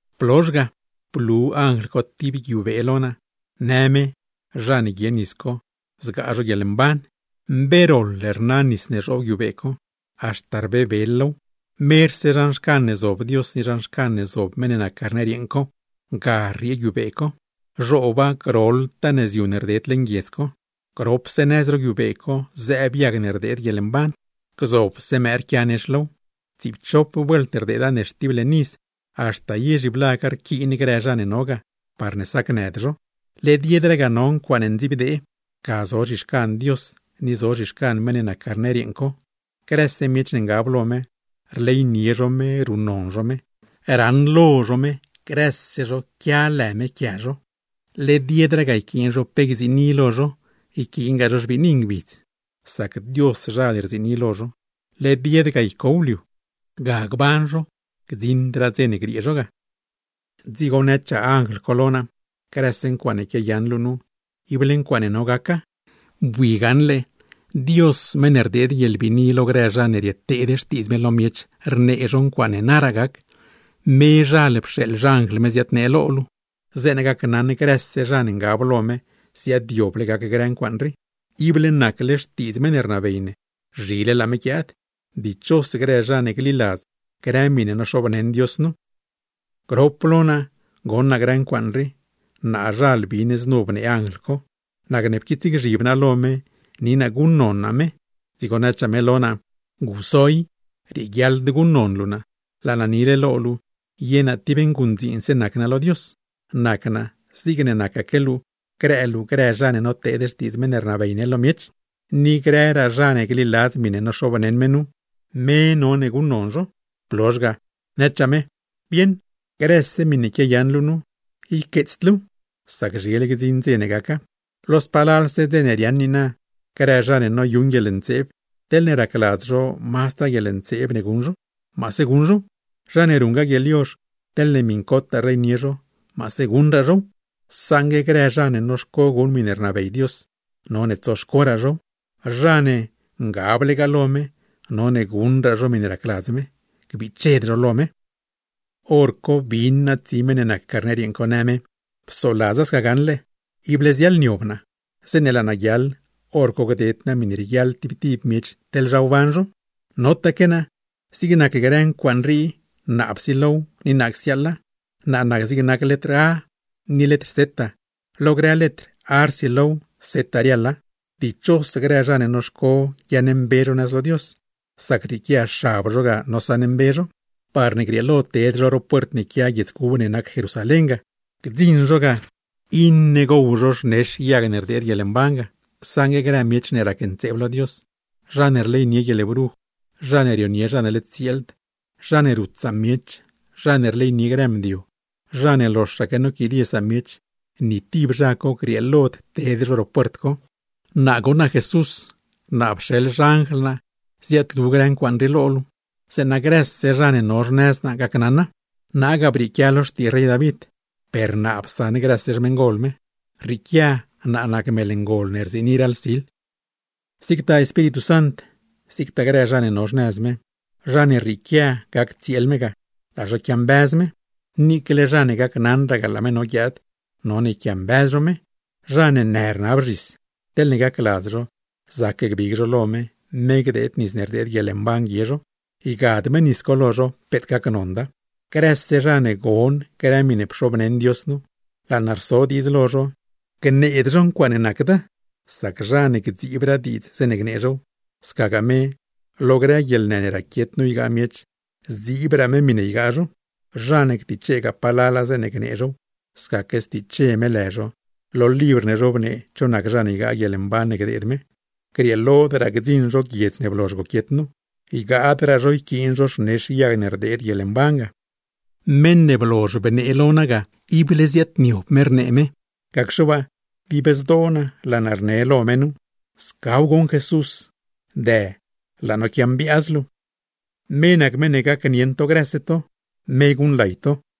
Blozh ga, blu anjl co tib guiubee lo naa, në me zha ne guie nis co, zgaa zho guieḻmban; mbe roḻ rnaw, haxta rbebel low. Merse zhan xcan ne zob Dios ni zhan xcan ne zob meṉ ne nac Carner yeeṉ co, ga rriee guiubee co, rdeda groḻtaa nëzyu ne rded leṉ guiedz co. Gropse nëz ro guiubee co zëëb yag ne rdeed guieḻmban, gzobse mëë rquia nex low, tsiipchop vuelt rdeeda nex tib leṉ iz, haxta ye zhiblaga rquiin grë zha ne no ga, parne sacnëd zho. Led yedraa ga no ncuaaṉe ndziibdee, ga zo zhixcan Dios ni zo zhixcan meṉ ne nac Carner yeeṉ co; grëse miech ne ngab lo me, rleynie zho me ruṉnon zho me. Raṉlo zho me, grëse zho quia lë me quia zho. Led yedraa ga yquiin zho pe gziini lo zho, yquiingaa zho xbiini ngbidz, sac Dioszhal rziini lo zho, led yed ga ycow liu; ga gban zho gdziṉdraa dze ne griee zho ga. Dzigo nëchaa anjl co lo naa: ―Grëse ncuaaṉe quiayaṉ luu nu, ible ncuaaṉe no gaca. Bui gaṉle Dios meṉ ne rdeed guieḻbiini lo grë zha ne rieteed xtiidz me lo miech, rnee zho ncuaaṉe naraa gac, mezhal pxeeḻ xanjl me ziadnee lo luu, zeeṉa gacnaṉ grëse zha ne ngab lo me ziaadyoble gac grë ncuaaṉ rii. Ible nacle xtiidz meṉ ne rnabey ne, zhile laa me guiaad. ¡Dichos grë zha ne gliladz grë miṉe noxobneṉ Dios nu! Grop lo naa goṉ naa grë ncuaaṉ rii, naazhal bin znu bnee anjl co. Nacne pquiitsgzhib naa lo me ni naa guṉnon naa me; dzigo nëchaa me lo naa: ―Guso i, rieguiaḻd guṉnon luu naa, laa naa nile lo luu ye naa tib nguṉdziinse nac naa lo Dios, nac naa zigne nacaque luu grë luu grë zha ne noteed xtiidz meṉ ne rnabey ne lo miech, ni grëraa zha ne gliladz miṉe noxobneṉ me nu. Me none guṉnon luu. Blozh ga, nëchaa me: ―Bieṉ, grëse miṉe quiayaṉ luu nu, yqueetsd luuw, sac zhile gdziṉ dze ne gaca. Lo spalalse dze ne riaaṉ niina, grë zha ne noyuṉ guieḻntseeb, teḻne racladz zho mazdraa guieḻntseeb ne guṉ zho, maase guṉ zhow; zha ne ruṉgaa guieḻyozh, teḻne miṉcotaa rleynie zho, maase guṉraa zhow. Saṉgue grë zha ne noxco guṉ miṉe rnabey Dios, none tsoxcoraa zhow; zha ne ngablegaa lo me, none guṉraa zho miṉe racladz me, gbiched zho lo me. Horco bin naa tsi meṉ ne nac Carner yeeṉ co, në me: ―Psoladza sca goṉ, ible ziaḻniob naa; zeeṉe laa naa guiaḻ, hor co gded naa miṉe rieguiaḻ tib tib miech, teḻ zha wban zho. Notaque naa, zig nac grë ncuaaṉ rii naa psilow ni naa csiaaḻa; nac naa zig nac letr “a” ni letr “z” lo grë letr, “a” rsilow, “z” riaḻa. Dichos grë zha ne noxco guiaaṉmbe zho nëz lo Dios, sac rrieequia xab zho ga nosaṉmbe zho, parne grieelo ted zho ro puert ne quia guiedz cub ne nac Jerusalén ga; gdziṉ zho ga iṉe gow zho xnex yag ne rdeed guieḻmban ga. Saṉgue grë miech ne racntseeb lo Dios, zha ne rleynie guieḻbruj, zha ne rionie zha ne led tsieeld, zha ne rut samiech, zha ne rleynie grë mdio, zha ne loxaque noquidie samiech, ni tib zha co grieelod ted ro puert co. Naa goṉ nac Jesús, naa pxeḻ xanjl naa ziaadlu grë ncuaaṉ rii lo luu, zeeṉa grëse zha ne no xnëz naa gacnaṉa. Naa ga brieequia lo xtii rey David, per naa psaṉ grëse xmeṉgol me. Rrieequia naa nac mel ngol ne rziini raḻ sil. Zigtaa Espíritu Sant, zigtaa grë zha ne no xnëz me, zha ne rrieequia gac tsieel me ga, laa zho quiambëz me; niicle zha ne gacnaṉragaa laa me no guiaad, none yquiambëz zho me. Zha ne në rnab zhis, teḻne gacladz zho zac gbig zho lo me, me gdeed nis ne rdeed guieḻmban guie zho; ygad me nis co lo zho, peet gacnonda. Grëse zha ne gon grë miṉe pxobneṉ Dios nu, laa naa rso diidz lo zho: Gneed zho ncuaaṉe nacda, sac zha ne gdziibraa diidz zeeṉe gnee zhow, scagaa me, lo grë guieḻnë ne raquiet nu ygaa miech, zdziibraa me miṉe ygaa zho; zha ne ctichegaa palala zeeṉe gnee zhow, scaque stiche me lë zho lo libr ne zhobnee cho nac zha ne ygaa guieḻmban ne gdeed me, grieelodraa gdziṉ zho guiedz ne blozh goquiet nu, ygaadraa zho yquiin zho xnex yag ne rdeed guieḻmban ga. Meṉ ne blozh bnee lo naa ga, ible ziaadniob me rnee me. Gacxe waa, dib zdoo naa laa naa rne lo me nu: ―¡Scaw goṉ Jesús! ¡Dë, laa no quiambiaaz luu! Me nac meṉ ne gacnieṉ to grëse to, me guṉlay to. Juan